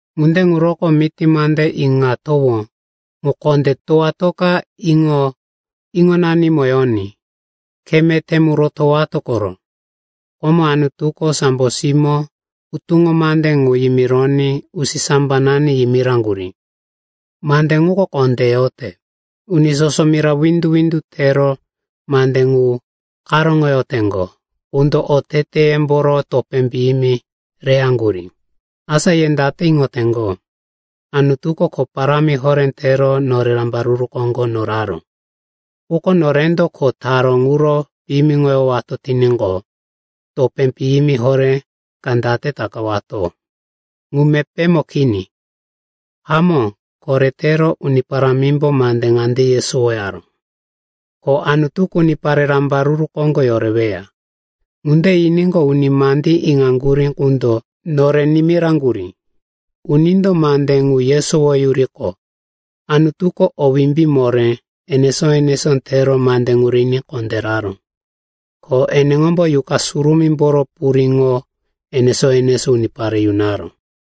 Ŋunde ŋuroko miti mande iŋatowó ŋu kondé towatoka iŋo-iŋonanimo yoní. Khe meté mu rotowato koro. Komo Anutuko sambo simó hutuŋo mande ŋu yimironí usisambanani yimiraŋgurí. Mande ŋuko kondé yote. Uni soso mira windu-windu tero mande ŋu karóŋoyoteŋgo qundo oteteyemboro topé piyimi reyaŋgurí. Asa ye date iŋoteŋgo? Anutuko kho parámi horé tero norero rambaruru koŋgo noraró. Quko norendo kho taró ŋuro piyimiŋoyowato tiníqo, topé piyimi horé ka date takawato? Ŋu mepémo kini. Hamó, koretero Uni Parámimbo mande ŋande yesowaró, ko Anutuko unipare rambaruru koŋgo yoreweya. Ŋunde yiníqo, uni mandí iŋaŋgurí qundo nore nimiraŋgurí. Unindo mande ŋu yesowoyuriqo, Anutuko o wimbí moré enesó-enesó tero mande ŋu riní kondéraró, ko eneŋombo Yuqa Surumímboro puriŋo enesó-enesó unipare yunaró.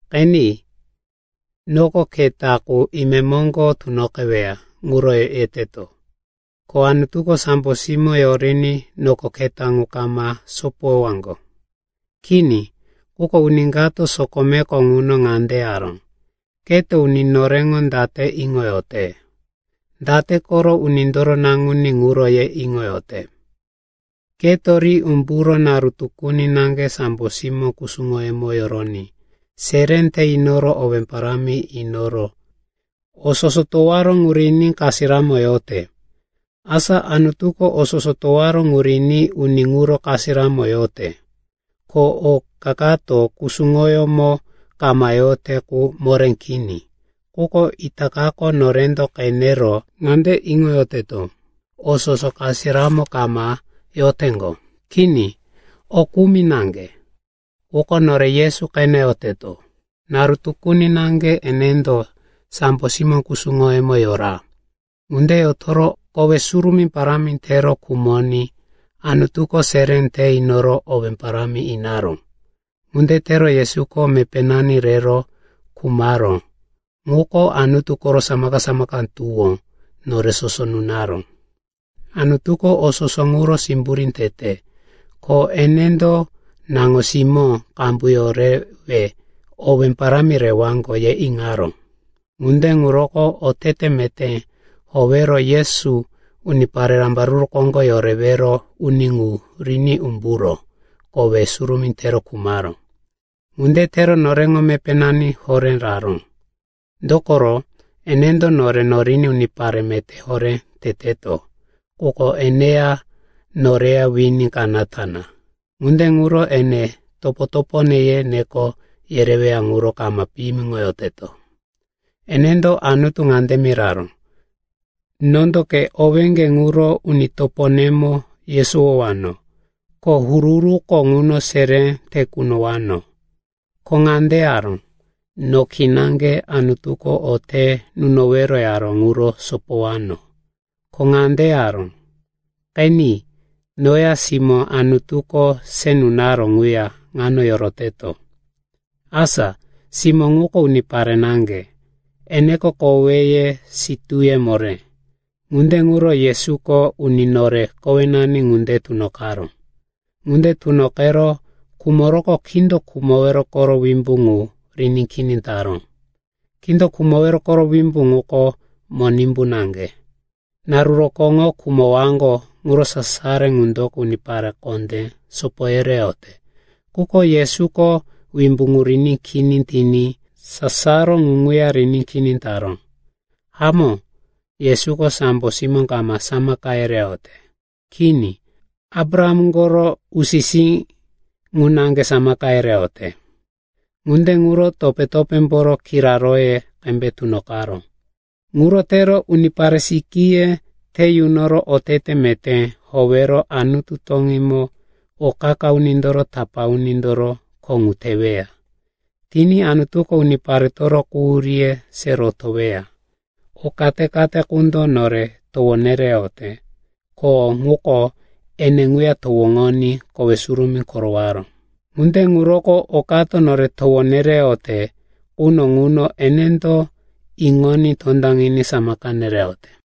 Qeni, noko keta qu imemoŋgo tunoqeweya ŋuro yeteto. Ko Anutuko sambo simó yoriní noko keta ŋu kama sopoyowaŋgo. Kini. Quko uni kato sokomeko ŋuno ŋande yaró, “Keto uni noreŋo date iŋoyote? Date koro unindoro naŋuní ŋuro ye iŋoyote? Keto ri umburo naru tukuni naŋge sambo simó kusuŋoyemo yoroní seré te inoro owé parámi inoro o soso towaró ŋu riní kasiramo yote.” Asa Anutuko o soso towaró ŋu riní uni ŋuro kasiramo yote, ko oka kato kusuŋoyómo kama yote qu moré kini. Quko itakako norendo qenero ŋande iŋoyoteto, o soso kasiramo kama yoteŋgo. Kini, o kumi naŋge. Quko nore Yesu qeneyoteto. Naru tukuni naŋge enendo sambo simó kusuŋoyemo yora. Ŋunde yotoro kowe surumí parámi tero khumoní Anutuko seré te inoro owé parámi inaró. Ŋunde tero Yesuko mepénani rero khumaró ŋuko Anutu koro samaka-samaka tuwó nore soso nunaró. Anutuko o soso ŋuro simburí tete, ko enendo, naŋo-simó qambu yorewe owé parámi rewaŋgo, ye iŋaró. Ŋunde ŋuroko otete meté howero Yesu, unipare rambaruru koŋgo yorewero uni ŋu, riní umburo kowe surumí tero khumaró. Ŋunde tero noreŋo mepénani horé raró. Dokoro enendo nore noriní unipare meté horé teteto, quko eneya noreya wini kanata na. Ŋunde ŋuro ene, “Topo-topone,” ye neko yereweya ŋuro kama piyimiŋoyote. Enendo Anutu ŋande miraró, “Nondo ke owéŋge ŋuro uni toponemo yesowowano, ko huru-huruko ŋuno seré te kunowano.” Ko ŋande yaró, “No kinaŋge Anutuko o te nunowero yaró ŋuro sopowano.” Ko ŋande yaró, “Qeni. Noya simó Anutuko se nunaró ŋuya ŋano yoroteto.” Asa simó ŋuko unipare naŋge, eneko koweye, sitúye moré. Ŋunde ŋuro Yesuko uni nore kowenani ŋunde tunoqaró. Ŋunde tunoqero khumoroqo kindo khumowero koro wimbí ŋu riní kini taró. Kindo khumowero koro wimbí ŋuko Monimbu naŋge. Naru rokóŋo khumowaŋgo ŋuro sasaro ŋundoko unipare kondé sopo yereyote. Quko Yesuko wimbí ŋu riní kini tiní sasaro ŋu ŋuya riní kini taró. Hamó, Yesuko sambo simó kama samaka yereyote. Kini, Abraham koro usi-sí ŋu naŋge samaka yereyote. Ŋunde ŋuro topé-topémboro kiraróye qembe tunoqaró. Ŋuro tero unipare sikíye te yunoro otete meté howero Anutu toŋímo o qa-qa unindoro tapá unindoro kho ŋu teweya. Tiní Anutuko uniparetoro quhuríye se rotoweya. O kate-kate qundo nore towo nereyote, ko o ŋuko ene ŋuya towoŋoní kowe surumí korowaró. Ŋunde ŋuroko okato nore towo nereyote quno ŋuno enendo iŋoní tondaŋiní samaka nereyote.